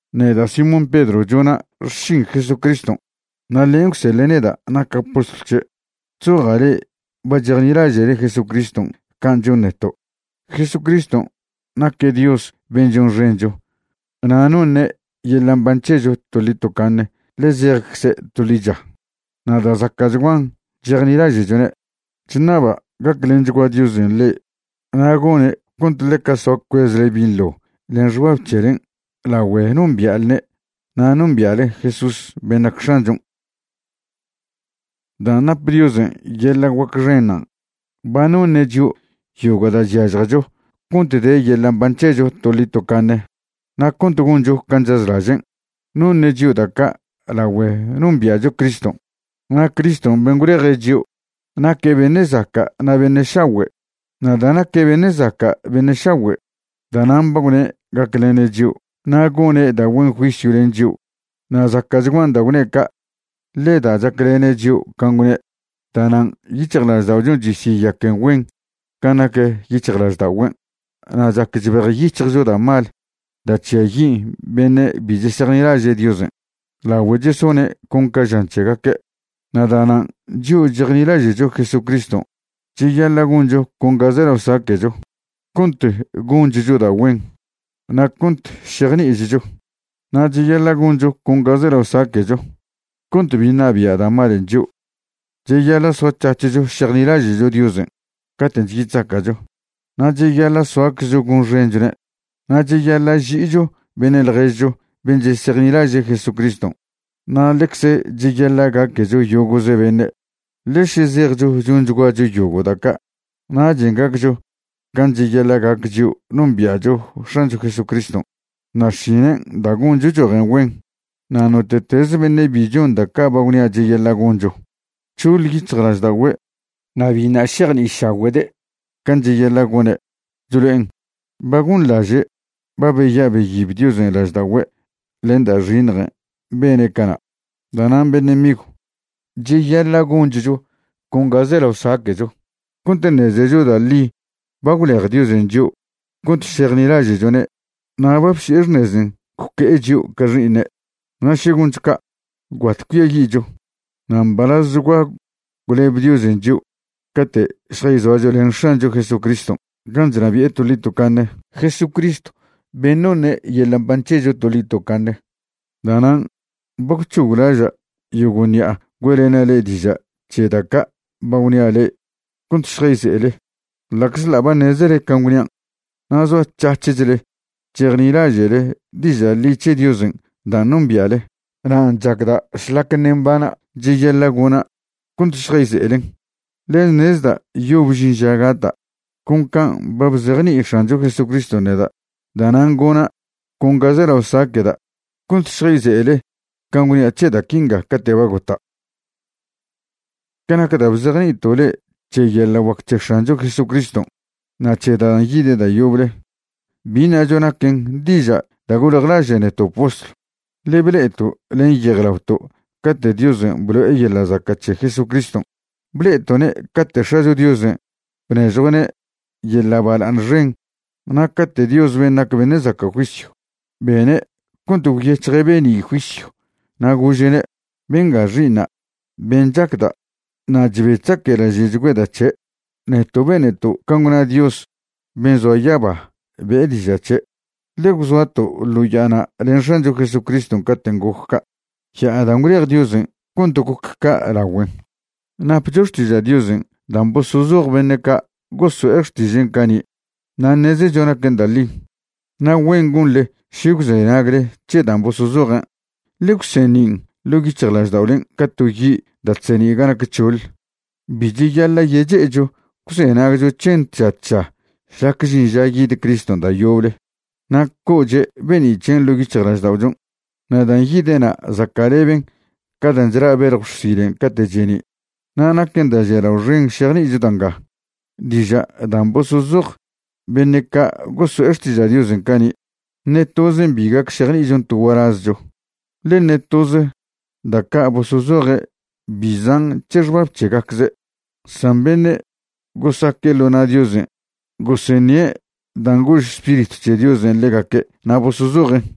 Neda' Simón Pedro chona' xšin Jesucriston', na' ḻen' gwseḻe' neda' naca' postlw c̱he'. Chzoja' le'e ba chejnilaže'le Jesucriston' can' chon neto'. Jesucriston' naque' Dios ben' chonxencho na' noṉe' yeḻa' mban c̱hecho toḻi tocaṉe ḻe zejcze' to ḻicha. Na' da' zaca'chguan chejnilaže'chone'. Chṉaba' gaclenchgua Diosen' le'e na' gone' cont ḻeca soa cuezle binḻo len xbab c̱helen' lagüe nombia'lne' na' nombia'le Jesús ben' nac X̱anchon'. Dan' nap Diosen' yeḻa' guac xenṉan', ba noṉe' chio' yogo' da' chyažjecho cont de yeḻa' mban c̱hecho toḻi tocaṉe na' cont goncho can' chazlažen'. Noṉe' chio' da' ca' lagüe nombia'cho Criston', na' Criston' ben' gwleje' chio' naque' beṉe' zaca' na' beṉe' šagüe'. Na' da' naque' beṉe' zaca' beṉe' šagüe', da'nan' ba gwne' gaclene' chio' na' gone' da' güen juisyw len chio'. Na' zaca'chguan da' gwne' ca', ḻe da' chaclene' chio' can' gwne', da'nan' yic̱hjlažda'ochon' chesyeyaquen güen can' nac yic̱hjlažda'ogüen', na' chac chbejyic̱hjcho da' mal da' chžiayin' beṉe' bi chesejnilaže' Diosen', lagüe chesone' con ca žan c̱hegaque'. Na' da'nan' chio' chejnilaže'cho Jesucriston' cheyaḻa' goncho con ga zelao saque'cho cont gonchcho da' güen, na' cont šejni'ichcho. Na' cheyaḻa' goncho con ga zelao saque'cho cont bi ṉabia' da' malen' chio'. Cheyaḻa' soac̱hac̱hcho šejnilaže'cho Diosen' caten' chyi chzaca'cho, na' cheyaḻa' soaczcho gonxenchone'. Na' cheyaḻa' ži'icho beṉe' ḻježcho ben' chesejnilaže' Jesucriston', na' ḻecze cheyaḻa' gaquecho yogo'ze beṉe'. Ḻe še zejcho chonchguacho yogo' da' ca', nachen' gaccho can' cheyaḻa' gac chio' nombia'cho X̱ancho Jesucriston', na' xšinen' da' goncho chojen güen. Na' note'tez beṉe' bi chon da' ca' ba gwnia' cheyaḻa' goncho, nc̱hoḻ yic̱hjlažda'ogüe' na' biṉa' šejni'išagüe'de' can' cheyaḻa' gone'. Chlo'en ba gonḻaže' ba beya' beyib Diosen' lažda'ogüe' len da' xiṉjen' bene' cana'. Da'nan' beṉe' migw, cheyaḻa' gonchcho con ga zelao saque'cho cont ṉezecho da' ḻi ba gwlej Diosen' chio' cont šejnilaže'chone' na' ba bsi'e xṉezen' gwque'e chio' ca xi'iṉe'. Na' še goncho ca', gwbat cuiayi'cho, na' mbalazchgua gwleb Diosen' chio' cate' šjayzoacho len X̱ancho Jesucriston' gan' chnabi'e toḻi tocaṉe, Jesucristw ben' noṉe' yeḻa' mban c̱hecho toḻi tocaṉe. Da'nan' ba gwc̱hoglaža' yogo' ṉi'a güe'lena' le'e diža' c̱he da' ca' ba gwnia' le'e cont šjayze'ele, ḻa'czḻa' ba ṉezele can' gwnian' na' zoac̱hac̱hle chejnilaže'le diža' ḻi c̱he Diosen' dan' nombia'le. Nan' chacda' šlac ṉe' mbana' cheyaḻa' gona' cont šjayze'elen. Ḻe ṉezda' yob žin ža gata', con can' ba bzejni'i X̱ancho Jesucriston' neda'. Da'nan' gona' con ga zelao saque'da' cont šjayze'ele can' gwnia' c̱he da' quinga cate' ba gota'. Ca nac da' bzejni'ito' le'e c̱he yeḻa' guac c̱he X̱ancho Jesucriston' na' c̱he dan' yide' da' yoble, bi ṉacho naquen diža' da' goljlaže' neto' postlw, ḻe ble'eto' len yejlaoto' cate' Diosen' blo'e yeḻa' zaca' c̱he Jesucriston'. Ble'eto'ne' cate' X̱acho Diosen' bnežjue'ne' yeḻa' bala'aṉ xen na' cate' Dios ben' nac beṉe' zaca' juisyw bene' cont gwyec̱hje' be'ni' juisyw na' gože'ne': “Benga Xi'iṉa' ben' chacda' na' chbe chezaquelaže'chgüeda' c̱he'.” Neto' beneto' can' gwna Dios ben' zoa yaba be'e diža' c̱he', ḻe gwzoato' ḻo ya'ana' len X̱ancho Jesucriston' caten' goc ca', ya'a dan' gwlej Diosen' cont goc ca' lagüen. Napcho Xtiža' Diosen' dan' bosozoj beṉe' ca' goso'e xtižen' cani' na' ṉezecho naquen da' ḻi. Na' güen gonḻe še gwzenagle c̱he dan' bosozojen', ḻe gwseṉin' ḻo' yic̱hjlažda'olen' ca to yi' da' chseṉi' ga nac c̱hoḻ. Bi cheyaḻa' yeche'echo gwzenagcho c̱hen tža tža šlac žin ža yid Criston' da' yoble na' co'oche' be'ni' c̱hen' ḻo' yic̱hjlažda'ochon'. Na' dan' yide'na' zaca'leben ca dan' chla' beljw xsilen' cate' cheni'. Na' naquen da' žialao xen šejni'icho da' nga: diža' dan' bosozoj beṉe' ca' goso'e xtiža' Diosen' cani', ṉe tozen bi gac šejni'ichon to gualazcho, ḻe ṉe toz da' ca' bosozoje' bi zan' c̱he xbab c̱hegacze'. San beṉe' gosaque' ḻo na' Diosen' goseṉie' dan' gož Spiritw c̱he Diosen' ḻegaque' na' bosozojen'.